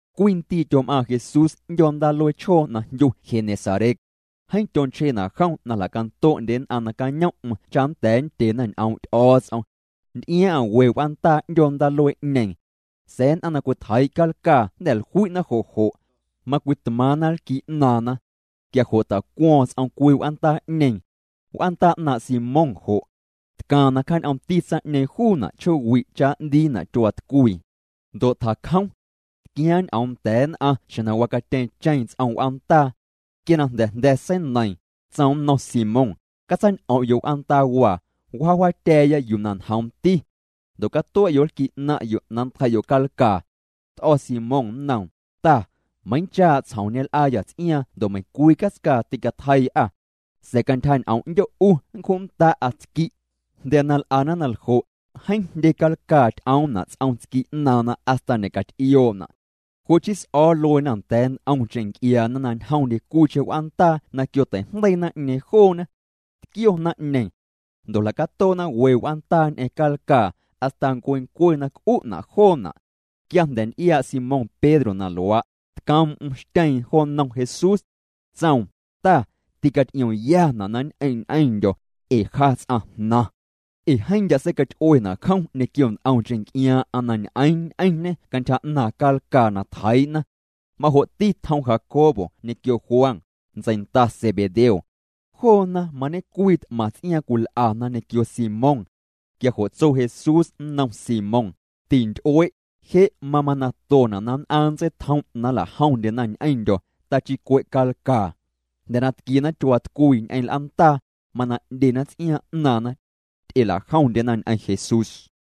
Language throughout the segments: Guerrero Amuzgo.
Cwii ndii' tyom'aaⁿ Jesús 'ndyoo ndaaluee chjoo na jndyu Genesaret. Jeeⁿ tyonchjena' jom na jla'canto'ndye nn'aⁿ nacañom'm cha nnda̱a̱ nndyena ñ'oom' Ty'o̱o̱ts'om. Nty'iaaⁿ'aⁿ we w'aandaa 'ndyoo ndaaluee'ñeeⁿ. Sa̱a̱ nn'aⁿ na cwitjeii' calcaa jnda̱ jlui'na jo' jo'. Macwitmaaⁿna nlqui' 'naaⁿna. Quia jo' tjacuo̱o̱ⁿ ts'om cwii w'aandaa'ñeeⁿ. W'aandaa 'naaⁿ' Simón jo'. Tcaaⁿ na cjaañ'oomti tsaⁿ'ñeeⁿ juuna' chjoowi' cha n'ndiina' tyuaatcwii. Ndo' tjacjom. Tquiaaⁿ ñ'oom nda̱a̱ nn'aⁿ xjeⁿ na wacatyeeⁿcheⁿ ts'om w'aandaa. Quia na jnda̱ jnda̱ seineiiⁿ, tsoom nnom Simón: —Catsaañ'om'yo' w'aandaawaa, wjaawjaatya̱a̱ya yuu na njoomti. Ndo' catue'yo' nlqui' 'naⁿ'yo' na nntjei'yo' calcaa. T'o̱ Simón nnoom: —Ta, meiiⁿchaa' tsjom ñel'aayâ ts'iaaⁿ ndo' meiⁿcwii catscaa tîcatjeii'â. Sa̱a̱ cantyja ñ'oom 'ndyo' 'u nncju'nnda'a tsqui'. Jnda̱ na l'ana na ljo', jeeⁿ jndye calcaa ty'oomna' ts'om tsqui' 'naaⁿna hasta ñe'caty'ioo'na'. Jo' chii s'o̱o̱ lueena nda̱a̱ nt'omcheⁿ nc'iaana na ñjomndye cwiicheⁿ w'aandaa na quiotei'jndeii naⁿ'ñeeⁿ joona. Tquio naⁿ'ñeeⁿ. Ndo' jla'catoo'na we w'aandaa ñ'eⁿ calcaa, hasta ncuencue na c'u'na' joona'. Quia jnda̱ nty'iaa' Simón Pedro na luaa', tcoom'm xtyeeⁿ jo nnom Jesús. Tsoom: —Ta, ticaty'iomyana' na nñ'eⁿ' ñ'eⁿndyo̱, ee ja ts'aⁿjnaⁿ. Ee jeeⁿ ndya' seicaty'uena' jom ñequio nt'omcheⁿ nc'iaaⁿ'aⁿ na ñ'eeⁿ ñ'eⁿñê cantyja 'naaⁿ calcaa na tjeii'na. Majo'ti tjom Jacobo ñequio Juan, ntseinda Zebedeo. Joona mañecwii t'maⁿ ts'iaaⁿ cwil'ana ñequio Simón. Quia jo' tso Jesús nnom Simón: —Tinty'ue', je' mamanaⁿtona' na nn'aⁿ nntseitjom' na nla'jomndyena ñ'eⁿndyo̱, tachii cwe' calcaa. Jnda̱ na tquiena tyuaatcwii ñ'eⁿ l'aandaa, mana 'ndyena ts'iaaⁿ 'naaⁿna. Ty'elajomndyena ñ'eⁿ Jesús.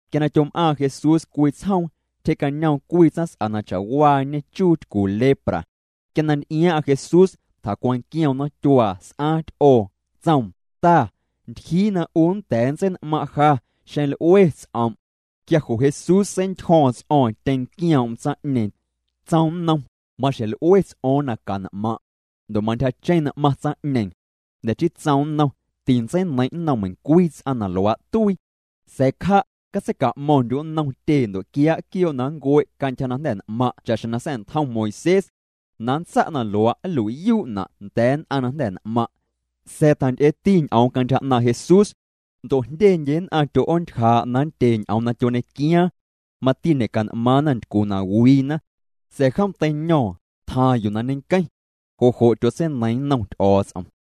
Quia na tyom'aaⁿ Jesús cwii tsjoom, tyjee'cañoom cwii tsaⁿs'a na cha'waañe chuu tycu lepra. Quia na nty'iaaⁿ'aⁿ Jesús, tjacwanquioom nomtyuaa, s'aaⁿ ty'oo, tsoom: —Ta, ntyjii na 'u nnda̱a̱ nntsein'maⁿ' ja, xeⁿ l'ue ts'om'. Quia jo' Jesús seintyjo̱o̱ⁿ ts'o̱o̱ⁿ tyeⁿnquioom'm tsaⁿ'ñeeⁿ. Tsoom nnom: —Maxjeⁿ l'ue ts'o̱o̱ⁿ na can'maⁿ'. Ndo' mantyjacheⁿ n'maⁿ tsaⁿ'ñeeⁿ. Jnda̱ chii tsoom nnom: —Tintseineiⁿ' nnom meiⁿcwii ts'aⁿ na luaa' tuii. Sa̱a̱ cja', catseica'mo̱ⁿndyu' nnom tyee ndo' quiaa' quioo' na nncue' cantyja na jnda̱ n'maⁿ' cha'xjeⁿ na sa̱'ntjom Moisés. Na nntsa' na luaa' nlui'yuu'na' nda̱a̱ nn'aⁿ na jnda̱ n'maⁿ'. Sa̱a̱ tjanty'eeti ñ'oom cantyja 'naaⁿ' Jesús. Ndo' jndyendye nn'aⁿ tyo'oontyjaa' na nndye ñ'oom na tyoñequiaaⁿ. Mati ñe'can'maaⁿna ntycu na wiina. Sa̱a̱ jom teiño̱o̱ⁿ, tjaaⁿ jo yuu na ñenqueⁿ. Jo' jo' tyotseineiiⁿ nnom Ty'o̱o̱ts'om.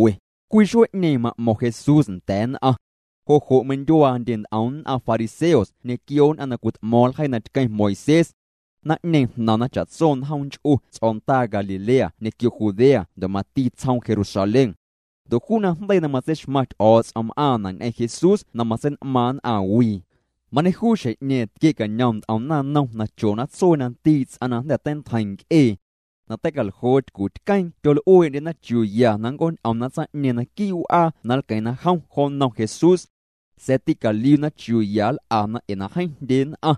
Cwii xuee'ñeeⁿ ma'mo̱ⁿ Jesús nda̱a̱ nn'aⁿ. Jo' jo' meindyuaandye nt'om nn'aⁿ fariseos ñequio nn'aⁿ na cwit'mo̱o̱ⁿ ljeii na tqueⁿ Moisés. Naⁿ'ñeeⁿ jnaⁿna cha'tso njoom nch'u ts'o̱ndaa Galilea ñequio Judea ndo' mati tsjoom Jerusalén. Ndo' juu najndeii na matseixmaⁿ Ty'o̱o̱ts'om m'aaⁿna' ñ'eⁿ Jesús na matsein'maaⁿ nn'aⁿwii. Mañejuu xjeⁿ'ñeeⁿ tquie'cañom nt'om naⁿnom na chona tsuee na ndii' ts'aⁿ na jnda̱ teintjeiⁿ nc'ee na tei'caljoo tycutqueeⁿ. Tyol'uee'ndyena chiuu ya na nnc'ooñ'omna tsaⁿ'ñeeⁿ naquii' w'aa na nlqueⁿna jom jo nnom Jesús. Sa̱a̱ tîcaliuna chiuu ya nl'ana ee na jeeⁿ jndye nn'aⁿ.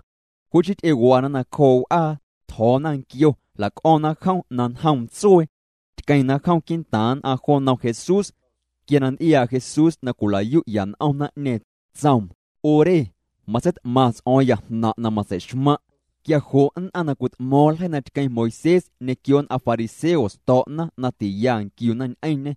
Jo' chii ty'ewana nacjoo' w'aa, tjo̱o̱na nquioo, jla'c'o̱ⁿna jom na njoom tsuee. Tqueⁿna jom quii'ntaaⁿ nn'aⁿ jo nnom Jesús. Quia na nty'iaa' Jesús na cwila'yu'ya n'om naⁿ'ñeeⁿ, tsoom: —'U re, matseit'maⁿ ts'o̱o̱ⁿya jnaⁿ' na matseixmaⁿ'. Quia jo' nn'aⁿ na cwit'mo̱o̱ⁿ ljeii na tqueⁿ Moisés ñequio nn'aⁿ fariseos to̱'na na tiya nquiuna ñ'eⁿñê.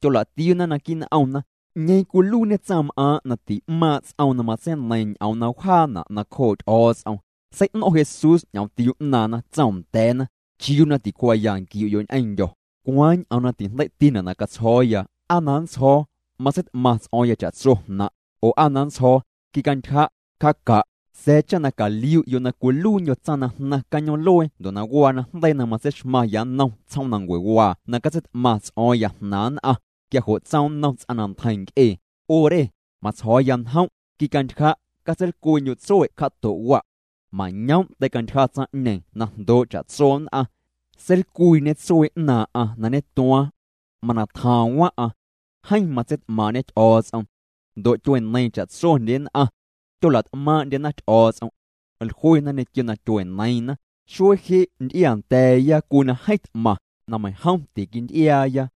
Tyola'tiuuna naquii' n'omna: “¿'Ñeeⁿ cwiluiiñe tsaⁿm'aaⁿ' na ti'maaⁿ' ts'oom na matseineiⁿ ñ'oom na wjaana' nacjoo' Ty'o̱o̱ts'om?” Sei'no̱ⁿ' Jesús ñ'omtiuu 'naaⁿna. Tsoom nda̱a̱na: —¿Chiuu na ticuaaya nquiu'yo' ñ'eⁿndyo̱? ¿Cwaaⁿ ñ'oom na tijndei'tina' na catsjo̱o̱ya? ¿Aa na nntsjo̱o̱: “Matseit'maⁿ ts'o̱o̱ⁿya cha'tso jnaⁿ'”, oo aa na nntsjo̱o̱: “Quicantyja', cja'ca'”? Sa̱a̱ cha caliu'yo' na cwiluiindyo̱ tsaⁿ na jnaⁿ cañoom'luee ndo' na waa najndeii na matseixmaⁿya nnom tsjoomnancuewaa na catseit'maⁿ ts'o̱o̱ⁿya jnaaⁿ nn'aⁿ, quia jo' tsoom nnom ts'aⁿ na ntjeiⁿ nc'ee: —'U re, matsjo̱o̱ya njom', quicantyja', catseilcwiindyu' tsue' cja'to' wa'. Mañoom' teicantyja tsaⁿ'ñeeⁿ na jndoo' cha'tso nn'aⁿ. Seilcwiiñê tsuee 'naaⁿ'aⁿ na ñetuaaⁿ. Mana tjaaⁿ waⁿ'aⁿ. Jeeⁿ matseit'maaⁿ'ñê Ty'o̱o̱ts'om. Ndo' tyueneiiⁿ cha'tsondye nn'aⁿ. Tyola't'maaⁿ'ndyena Ty'o̱o̱ts'om. Jluena ñequio na tyueneiiⁿna: —Xuee je' nty'iaa nda̱a̱ya cwii na jeeⁿ t'maⁿ, na meiⁿjom tiquinty'iaaya.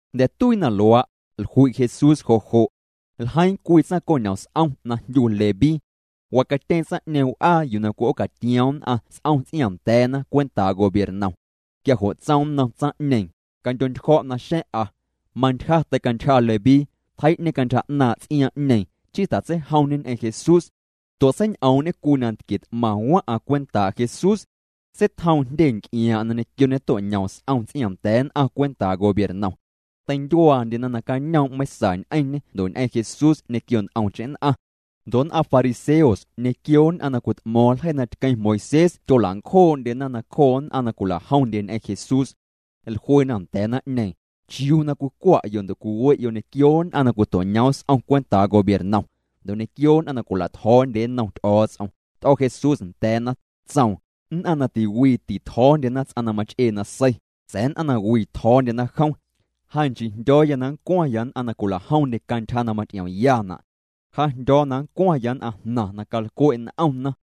Jnda̱ tuii na luaa', jlui' Jesús jo' jo'. Ljeiiⁿ cwii tsaⁿco'ñom s'om na jndyu Leví. Wacatyeeⁿ tsaⁿ'ñeeⁿ w'aa yuu na cwi'oocatioom nn'aⁿ s'om ts'iaaⁿnda̱a̱na cwentaa' gobiernom. Quia jo' tsoom nnom tsaⁿ'ñeeⁿ: —Candyo'ntyjo̱' naxa̱ⁿ'a. Mantyja teicantyja Leví, tjei'ñê cantyja 'naaⁿ' ts'iaaⁿ'ñeeⁿ, chii tjatseijomñê ñ'eⁿ Jesús. Ndo' seiñ'oom'ñê cwii nantquie t'maⁿ waⁿ'aⁿ cwentaa' Jesús. Seitjoom jndye nc'iaaⁿ'aⁿ na ñequio ñeto'ñoom s'om ts'iaaⁿnda̱a̱ nn'aⁿ cwentaa' gobiernom. Teindyuaandyena nacañoom' meiⁿsa ñ'eⁿñê ndo' ñ'eⁿ Jesús ñequio nt'omcheⁿ nn'aⁿ. Ndo' nn'aⁿ fariseos ñequio nn'aⁿ na cwit'mo̱o̱ⁿ ljeii na tqueⁿ Moisés tyola'ncjoo'ndyena nacjoo nn'aⁿ na cwila'jomndye ñ'eⁿ Jesús. Jluena nda̱a̱ naⁿ'ñeeⁿ: —¿Chiuu na cwicwa'yo' ndo' cwiwe'yo' ñequio nn'aⁿ na cwito'ñoom s'om cwentaa' gobiernom, ndo' ñequio nn'aⁿ na cwila'tjo̱o̱ndyena nnom Ty'o̱o̱ts'om? T'o̱ Jesús nda̱a̱na, tsoom: —Nn'aⁿ na tiwii titjo̱o̱ndyena ts'aⁿ na mach'ee nasei, sa̱a̱ nn'aⁿ na wii tjo̱o̱ndyena jom. Ja nchii jndyo̱o̱ya na nncwaⁿya nn'aⁿ na cwila'jomndye cantyja na maty'iomyana'. Ja jndyo̱o̱ya na nncwaⁿya nn'aⁿjnaⁿ na calcwe' n'omna.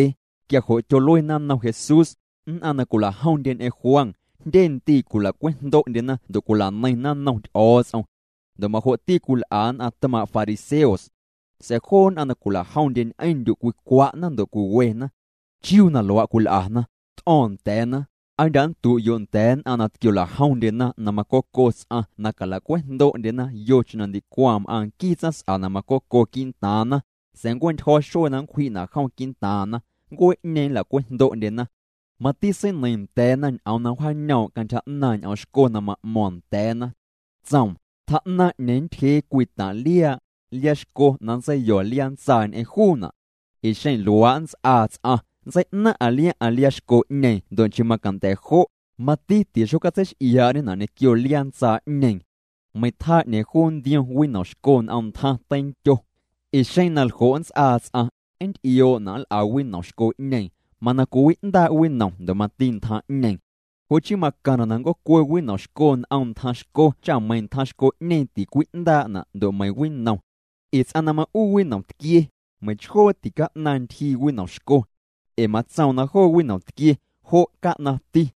Quia jo' tyoluena nnom Jesús: —Nn'aⁿ na cwila'jomndye ñ'eⁿ Juan, jndye ndii' cwila'cwejndo'ndyena ndo' cwila'neiⁿna nnom Ty'o̱o̱ts'om. Ndo' majo'ti cwil'a nn'aⁿ tmaaⁿ' fariseos. Sa̱a̱ joo nn'aⁿ na cwila'jomndye ñ'eⁿndyu' cwicwa'na ndo' cwiwena. ¿Chiuu na luaa' cwil'ana? T'o̱o̱ⁿ nda̱a̱na: —¿Aa ndya' nndu'yo' nda̱a̱ nn'aⁿ na tquiola'jomndyena na macoco ts'aⁿ na cala'cwejndo'ndyena yocheⁿ na ndicwaⁿ m'aaⁿ nquii tsaⁿs'a na macoco quii'ntaaⁿna? Sa̱a̱ nncue'ntyjo̱ xuee na nncwji'na' jom quii'ntaaⁿna, ncuee'ñeeⁿ nla'cwejndo'ndyena. Mati seineiiⁿ nda̱a̱na ñ'oom na wjaañoom' cantyja 'naaⁿ' ñ'oom xco na ma'mo̱o̱ⁿ nda̱a̱na. Tsoom: —Tjaa'naⁿ 'ñeeⁿ nntyjee cwii taⁿ' liaa', liaa xco na nntseiyo̱ liaa ntsaa ñ'eⁿ juuna'. Ee xeⁿ luaa' nnts'aa ts'aⁿ, nntsei'naaⁿ'aⁿ liaaⁿ'aⁿ liaa xco'ñeeⁿ ndo' nchii macanda̱ jo', mati tixocatseix'iaa'ñena' ñequio liaa ntsaa'ñeeⁿ. Meiⁿ tjaa 'ñeeⁿ juu nntiom winom xco n'om ntjaⁿ teindyo. Ee xeⁿ na ljo' nnts'aa ts'aⁿ, nnty'ioo'na' nl'a winom xco'ñeeⁿ, mana cwiwi'ndaa' winom ndo' mati ntjaⁿ'ñeeⁿ. Jo' chii macaⁿna' na nnc'oocue winom xco n'om ntjaⁿ xco cha meiⁿ ntjaⁿ xco'ñeeⁿ ticwi'ndaa'na' ndo' meiⁿ winom. Ee ts'aⁿ na ma'uu winom tquie, meiⁿchjoo tica'naⁿ ntyjii winomxco. Ee matsoom na joo winom tquie, jo' ca'naⁿti.